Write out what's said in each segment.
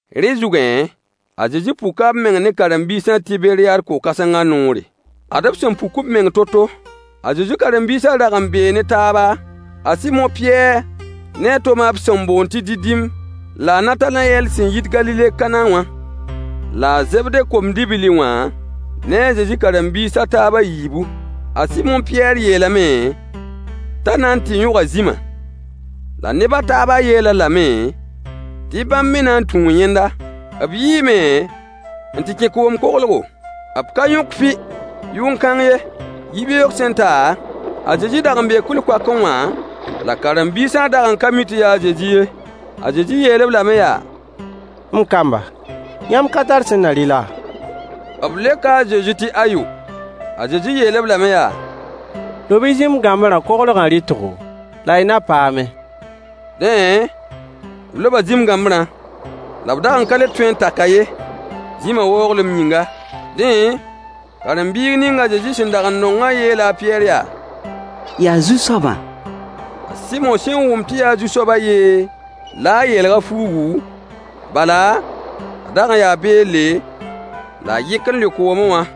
Rẽ zugẽ, a Zezi puka b meng ne karen-biisã Tiberyaad ko-kãsengã noore. Ad b sẽn puk b meng to-to: A Zezi karen-biisã rag n bee ne taaba: A Sɩmo Pɩyɛɛr ne a Toma b sẽn boond tɩ Didim, la a Natanayɛl sẽn yit Galile Kana wã, la a Zebde kom-dibli wã ne a Zezi karen-biis a taab a yiibu. A Sɩmo Pɩyɛɛr yeelame t'a na n tɩ yõga zĩma, la neb a taabã yeel-a lame tɩ bãmb me na n tũu yẽnda. B yiime n tɩ kẽ koom koglgo. B ka yõk fɩ yʋn-kãng ye. Yibeoog sẽn ta, a Zezi dag n bee kʋɩl-koakẽ wã, la karen-biisã dag n ka mi tɩ yaa a Zezi ye. A Zezi yeel-b lame yaa: M kamba, yãmb ka tar sẽn na rɩ laa? B leoka a Zezi tɩ ayo. A Zezi yeel-b lame yaa: Lob-y zĩm-gãmbrã koglgã rɩtgo, la y na paame. Dẽ, b loba zĩm-gãmbrã, la b dag n ka le tõe n tak-a ye, zĩmã waooglem yĩnga. Dẽ, karen-biig ning a Zezi sẽn dag n nongã yeela a Pɩyɛɛr yaa: Yaa Zu-soabã! A Sɩmo sẽn wʋm tɩ yaa Zu-soaba yee, la a yeelg a fuugu, bala, a dag n yaa beelle, la a yɩk n lʋɩ koomẽ wã.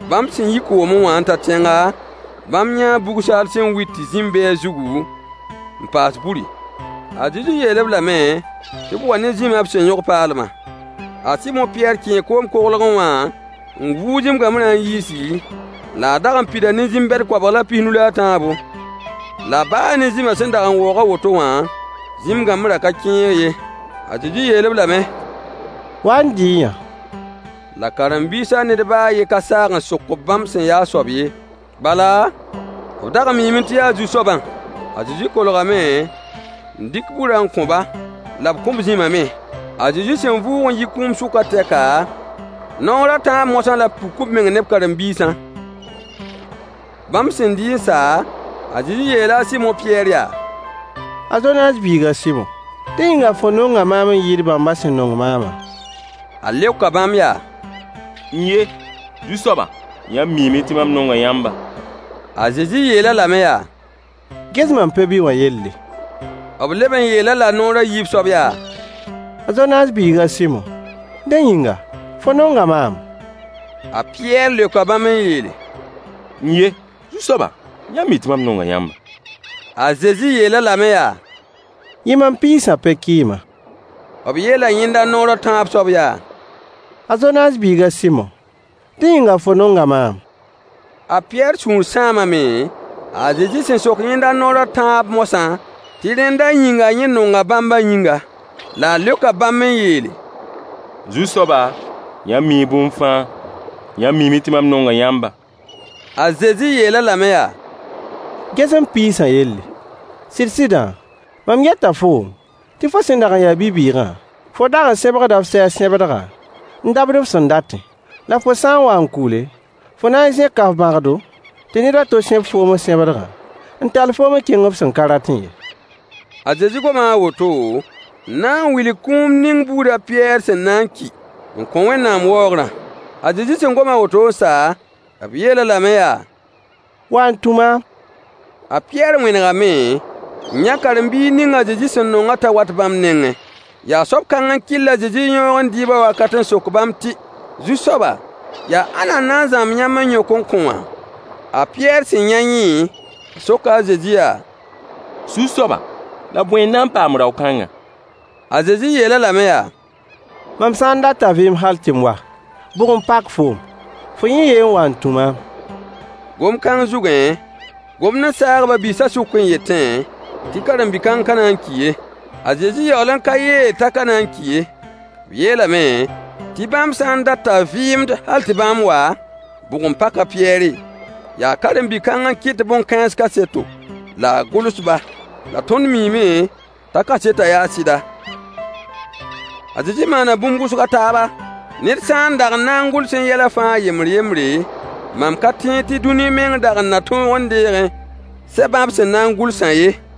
Bãmb sẽn yi koomẽ wã n ta tẽnga, bãmb yãa bug-saal sẽn wit tɩ zĩm be a zugu, n paas buri. A Zezi yeel-b lame tɩ b wa ne zĩmã b sẽn yõg paalmã. A Sɩmo Pɩyɛɛr kẽe koom-koglgẽ wã n vuug zĩm-gãmbrã n yiisi, la a dag n pida ne zĩm-bɛd koabg la pis-nu la a tãabo. La baa ne zĩmã sẽn dag n waoog a woto wã, zĩm-gãmbrã ka kẽeg ye. A Zezi yeel-b lame: Wa n dɩ-y-yã. La karen-biisã ned baa a yen ka saag n sok-b bãmb sẽn yaa a soab ye, bala, b dag n miime tɩ yaa Zu-soabã. A Zezi kolgame n dɩk burã n kõ-ba, la b kõ-b zĩmã me. A Zezi sẽn vʋʋg n yi kũum sʋkã tɛka, naoor a tãab moasã la b puk b meng ne b karen-biisã. Bãmb sẽn dɩ n sa, a Zezi yeela a Sɩmo Pɩyɛɛr yaa: A Zonaas biig a Sɩmo, dẽ yĩnga fo nonga maam n yɩɩd bãmbã sẽn nong maamã? A leoka bãmb yaa: N-ye, Zu-soaba! Yãmb miime tɩ mam nonga yãmba. A Zezi yeel-a lame yaa: Ges mam pe-bi wã yelle. B leb n yeel-a-la naoor a yiib soab yaa: A Zonaas biig a Sɩmo, dẽ yĩnga, fo nonga maam? A Pɩyɛɛr leoka bãmb n yeele: N-ye, Zu-soaba! Yãmb mi tɩ mam nonga yãmba. A Zezi yeel-a lame yaa: Yɩ mam piisã pe-kɩɩma. B yeela yẽnda naoor a tãab soab yaa: A Zonaas biig a Sɩmo, dẽ yĩnga fo nonga maam? A Pɩyɛɛr sũur sãamame, a Zezi sẽn sok yẽnda naoor a tãab moasã tɩ rẽnda yĩnga yẽ nonga bãmbã yĩnga. La a leoka bãmb n yeele: Zu-soaba, yãmb mii bũmb fãa. Yãmb miime tɩ mam nonga yãmba. A Zezi yeel-a lame yaa: Ges m piisã yelle. Sɩd-sɩdã, mam yeta foom tɩ fo sẽn dag n ya bi-bɩɩgã, fo dag n sẽbgda f sɛɛg sẽbdga, n dabd f sẽn datẽ. La fo sã n wa n kʋʋle, fo na n zẽka f bãgdo, tɩ ned a to sẽb foom f sẽbdgã, n tall foom n kẽng f sẽn ka ratẽ ye. A Zezi goma a woto n na n wilg kũum ning buud a Pɩyɛɛr sẽn na n ki n kõ Wẽnnaam waoogrã. A Zezi sẽn gom a woto n sa, b yeel-a lame yaa: Wa n tũ maam! A Pɩyɛɛr wẽnegame n yã karen-biig ning a Zezi sẽn nongã t'a wat bãmb nengẽ. Yaa soab kãng n kɩll a Zezi yãoogẽ dɩɩbã wakat n sok bãmb tɩ: Zu-soaba, yaa ãnna n na n zãmb yãmb n yõk n kõ wã? A Pɩyɛɛr sẽn yã yẽ, a soka a Zezi yaa: Zu-soaba, la bõe n na n paam rao-kãngã? A Zezi yeel-a lame yaa: Mam sã n dat t'a vɩɩmd hal tɩ mam wa, bʋg n pak foom? Fo yẽ ye n wa n tũ maam. Gom-kãng zugẽ, gomd n saag ba-biisã sʋk n yetẽ tɩ karen-bi-kãng ka na n ki ye. A Zezi yaool n ka yeel t'a ka na n ki ye. B yeelame tɩ bãmb sã n dat t'a vɩɩmd hal tɩ bãmb wa, bʋg n pak a Pɩyɛɛre? Yaa karen-bi-kãng n kɩt bõn-kãens kaseto, la a gʋls-ba. La tõnd miime t'a kasetã yaa sɩda. A Zezi maana bũmb wʋsg a taaba. Ned sã n dag n na n gʋlsẽ yɛla fãa yembr-yembre, mam ka tẽed tɩ dũni meng dag n na tõog n deegẽ sɛbã b sẽn na n gʋlsã ye.